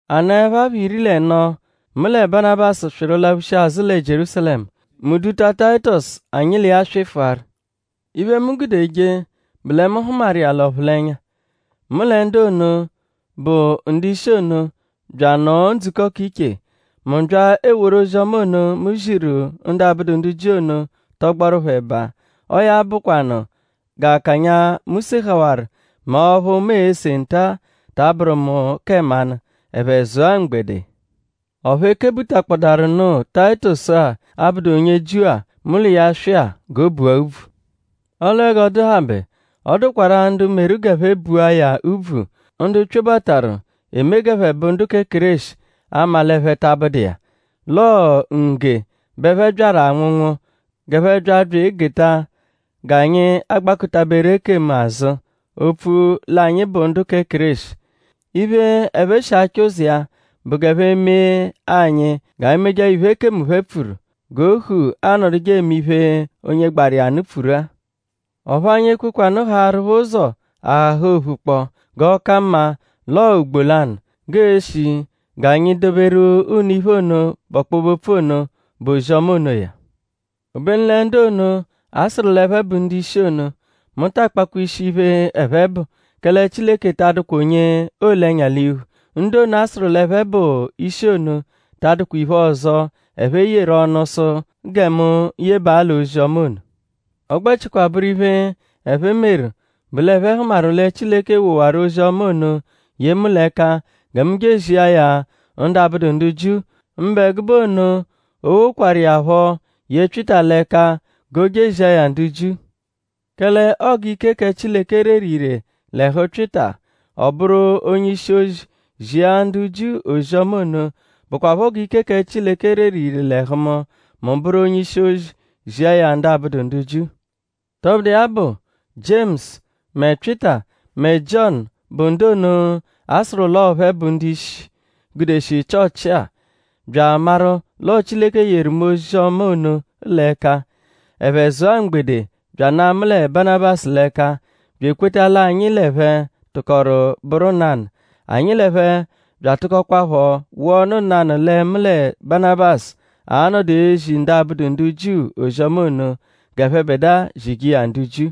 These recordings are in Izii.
A nọepho apha iri l'ẹno mu lẹ Banabasu swịru laphushia azụ lẹ Jierúsalẹmu. Mu duta Tayitọsu anyi l'iya swịfuaru. Iphe, mu gude jee bụ lẹ mu hụmaru iya l'ọphulenya. Mu lẹ ndu ono, bụ ndu-ishi ono bya anọo ndzukọ k'iche. Mu bya eworu ozi-ọma ono, mu ziru ndu abụdu ndu Jiu ono tọgboru phẹ ẹba. Ọo ya bụkwanu g'akanya, mu sehawaru mẹ ọphu mu ese nta-a ta abụru mu kẹ mmanụ. Ẹphe zụa mgbede. Ọphu e kebutakpọdaru nụ Tayitọsu-a, abụdu onye Jiu-a, mu l'iya swịa g'o bua úbvù. Ọle g'ọ dụhabe; ọ dụkwarua ndu meru g'ẹphe bua ya úbvù; ndu pyobataru eme g'ẹphe bụ ndu kẹ Kéreshi; 'ama l'ẹphe ta abụdu iya; l'ọo ngge bẹ ẹphe byaru anwụnwu g'ẹphe bya bya egeta g'anyi gbakụta-beru ekemu azụ opfu l'anyi bụ ndu kẹ Kéreshi. Iphe, ẹphe shi achọ ụzo iya bụ g'ẹphe mee anyi g'anyi mejeẹpho iphe ekemu phẹ pfuru g'ohu anọje eme iphe onye gbaru iya nụ pfuru-a. Ọphu anyi ekwekwanụ haarụ phẹ ụzo ahaha ophu kpọ g'ọ ka mma l'ọo mgbo lanụ g'ee-shi g'anyi edoberu unu iphe ono, bụ ọkpobe-opfu ono, bụ ozi-ọma onoya. Obenu lẹ ndu ono, a sụru l'ẹphe bụ ndu-ishi ono; mu ta akpakwa ishi iphe, ẹphe bụ; kẹle Chileke ta adụkwa onye oole ẹnya l'iphu; ndu ono, a sụru l'ẹphe bụ ishi ono ta adụkwa iphe ọzo, ẹphe yeru ọnu sụ gẹ mu yebaa l'ozi-ọma ono. Ọ gbẹchikwa bụru iphe, ẹphe meru bụ l'ẹphe hụmaru lẹ Chileke wowaru ozi-ọma ono ye mu l'ẹka gẹ mu je ezia ya ndu abụdu ndu Jiu; mbụ ẹgube ono o wokwaru iya phọ ye Pyịta l'ẹka g'o je ezia ya ndu Jiu. Kẹle ọo g'ike kẹ Chileke reru ire l'ẹhu Pyịta; ọ bụru onye-ishi-ozi zia ndu Jiu ozi-ọma ono; bụkwapho g'ike kẹ Chileke reru ire l'ẹhu mu; mu bụru onye-ishi-ozi zia ya ndu abụdu ndu Jiu. Tọbudu iya bụ; Jiemusu mẹ Pyịta mẹ Jiọnu bụ ndu ono, a sụru l'ọo phẹ bụ ndu-ishi, gudeshi Chịochi-a bya amaru l'ọo Chileke yeru mu ozi-ọma ono l'ẹka. Ẹphe zụa mgbede; bya ana mu lẹ Banabasu l'ẹka; bya ekweta l'anyi l'ẹphe tụkoru bụru nanụ. Anyi l'ẹphe bya atụkokwapho wụa ọnu nanụ lẹ mu lẹ Banabasu a-nọdu ezi ndu abụdu ndu Jiu ozi-ọma ono; g'ẹphebedua zije iya ndu Jiu.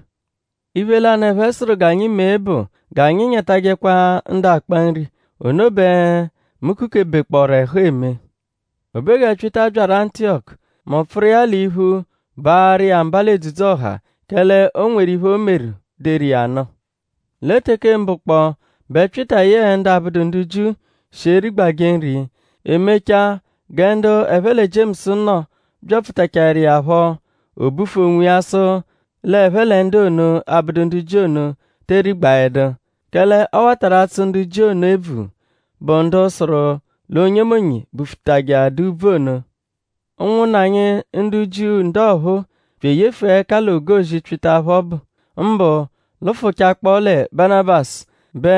Iphe lanụ, ẹphe sụru g'anyi mee bụ g'anyi nyatajẹkwa ndu akpa nri. Ono bẹ mu kukebekpọoru ẹhu eme. O be gẹ Pyịta byaru Antiyọku; mu pfụru iya l'iphu baarụ iya mba l'edzudzu-ọha; kẹle o nweru iphe, o meru deru iya nụ. Lẹ teke mbụ kpọ bẹ Pyịta yẹe ndu abụdu ndu Jiu shi erigbajẹ nri. E mechaa gẹ ndu ẹphe lẹ Jiemusu nọ byapfutachaẹru iya phọ; o bufu onwiya sụ l'ẹphe lẹ ndu ono, abụdu ndu Jiu ono tee rigbaẹdu. Kẹle ọ watarụ atsụ ndu Jiu ono ebvu, bụ ndu sụru l'onyemonye bufutajẹadaa úbvù ono. Ụnwunna anyi ndu Jiu ndu ọphuu bya eyefua ẹka l'ogozi Pyịta phẹ ọbu. Mbụ lụfuchakpo lẹ Banabasu bẹ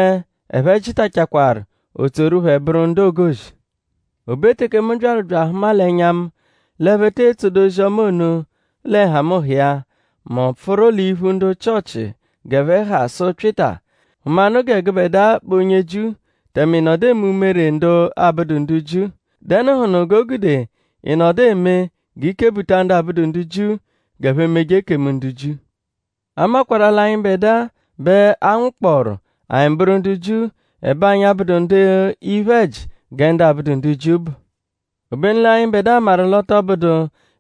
ẹphe jịtachakwaru o tsoru phẹ bụru ndu ogozi. O be teke mu byaru bya ahụma l'ẹnya mu; l'ẹphe te etsodu ozi-ọma ono lẹ nhamụnha iya; mu pfụru l'iphu ndu Chịochi g'ẹphe ha sụ Pyịta: “Hụmanu gẹ gụbedua bụ onye Jiu; tẹme ị nọdu eme umere ndu abụdu ndu Jiu;?Dẹnuhunu g'o gude ị nọdu eme g'i kebuta ndu abụdu ndu Jiu g'ẹphe meje ekemu ndu Jiu?” A makwarụ-a l'anyịbedua bẹ a nwụkpooru; anyi bụru ndu Jiu; ẹbe anyi abụdu ndu iphe-ẹji gẹ ndu abụdu Jiu bụ. Obenu l'anyịbedua maru l'ọ tọ bụdu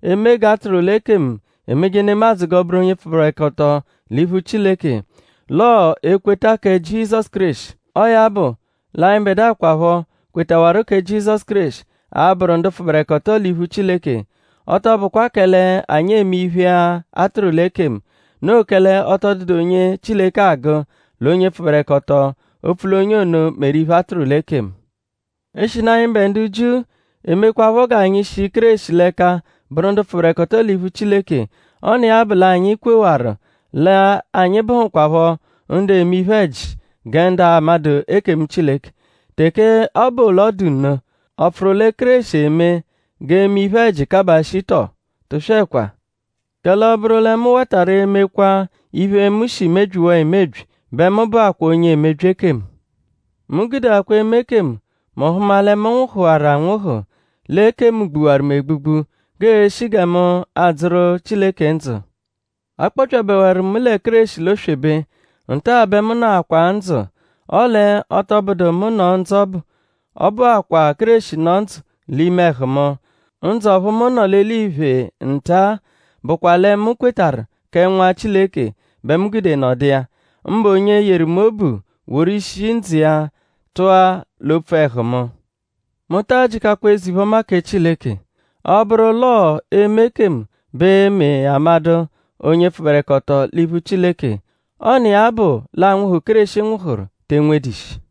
eme g'a tụru l'ekemu emeje nemadzụ g'ọ bụru onye pfụberekoto l'iphu Chileke; l'ọo ekweta kẹ Jizọsu Kéreshi. Ọo ya bụ l'anyịbedua kwaphọ, kwetawaru kẹ Jizọsu Kéreshi a-bụru ndu pfụberekoto l'iphu Chileke; ọ tọ bụkwa kẹle anyi eme iphe, a tụru l'ekemu. Noo kẹle ọ tọ dụdu onye Chileke agụ l'onye pfụberekoto opfu l'onye ono meru iphe, a tụru l'ekemu. Eshinu anyịbe ndu Jiu emekwaphọ g'anyi shi Kéreshi l'ẹka bụru ndu pfụberekoto l'iphu Chileke; ọ n'iya bụ l'anyi kwewaru l'anyi bụhukwapho ndu eme iphe-ẹji gẹ ndu amadụ ekemu Chileke. Teke ọ bụ l'ọ dụ nno;?ọ pfụru lẹ Kéreshi eme g'eme iphe-ẹji kabaa shii tọo? Tụswekwa! Kẹle ọ -bụru lẹ mu watarụ emekwaa iphe, mu shi mebyiwaa emebyi bẹ mu bụakwaa onye emebyi ekemu. Mu gudeakwa eme ekemu; mu hụma lẹ mu nwụhuwaru anwụhu; l'ekemu gbuwaru mu egbugbu; g'ee-shi gẹ mu a-dzụru Chileke ndzụ. A kpọpyabewaru mu lẹ Kéreshi l'oswebe. Nta bẹ mu nọakwaa ndzụ. Ọle ọ tọ bụdu mu nọ ndzụ ọbu; ọ bụakwaa Kéreshi nọ ndzụ l'ime ẹhu mu. Ndzụ ọphu mu nọ l'eliphe nta-a bụkwa lẹ mu kwetarụ kẹ Nwa Chileke bẹ mu gude nọdu iya; mbụ onye yeru mu obu; woru ishi ndzụ iya tụa l'opfu ẹhu mu. Mu taa jịkakwa eze-iphe-ọma kẹ Chileke. Ọ -bụru l'ọo eme ekemu bẹ e-me amadụ onye pfụberekoto l'iphu Chileke; ọ n'iya bụ l'anwụhu, Kéreshi nwụhuru te enwedu ishi.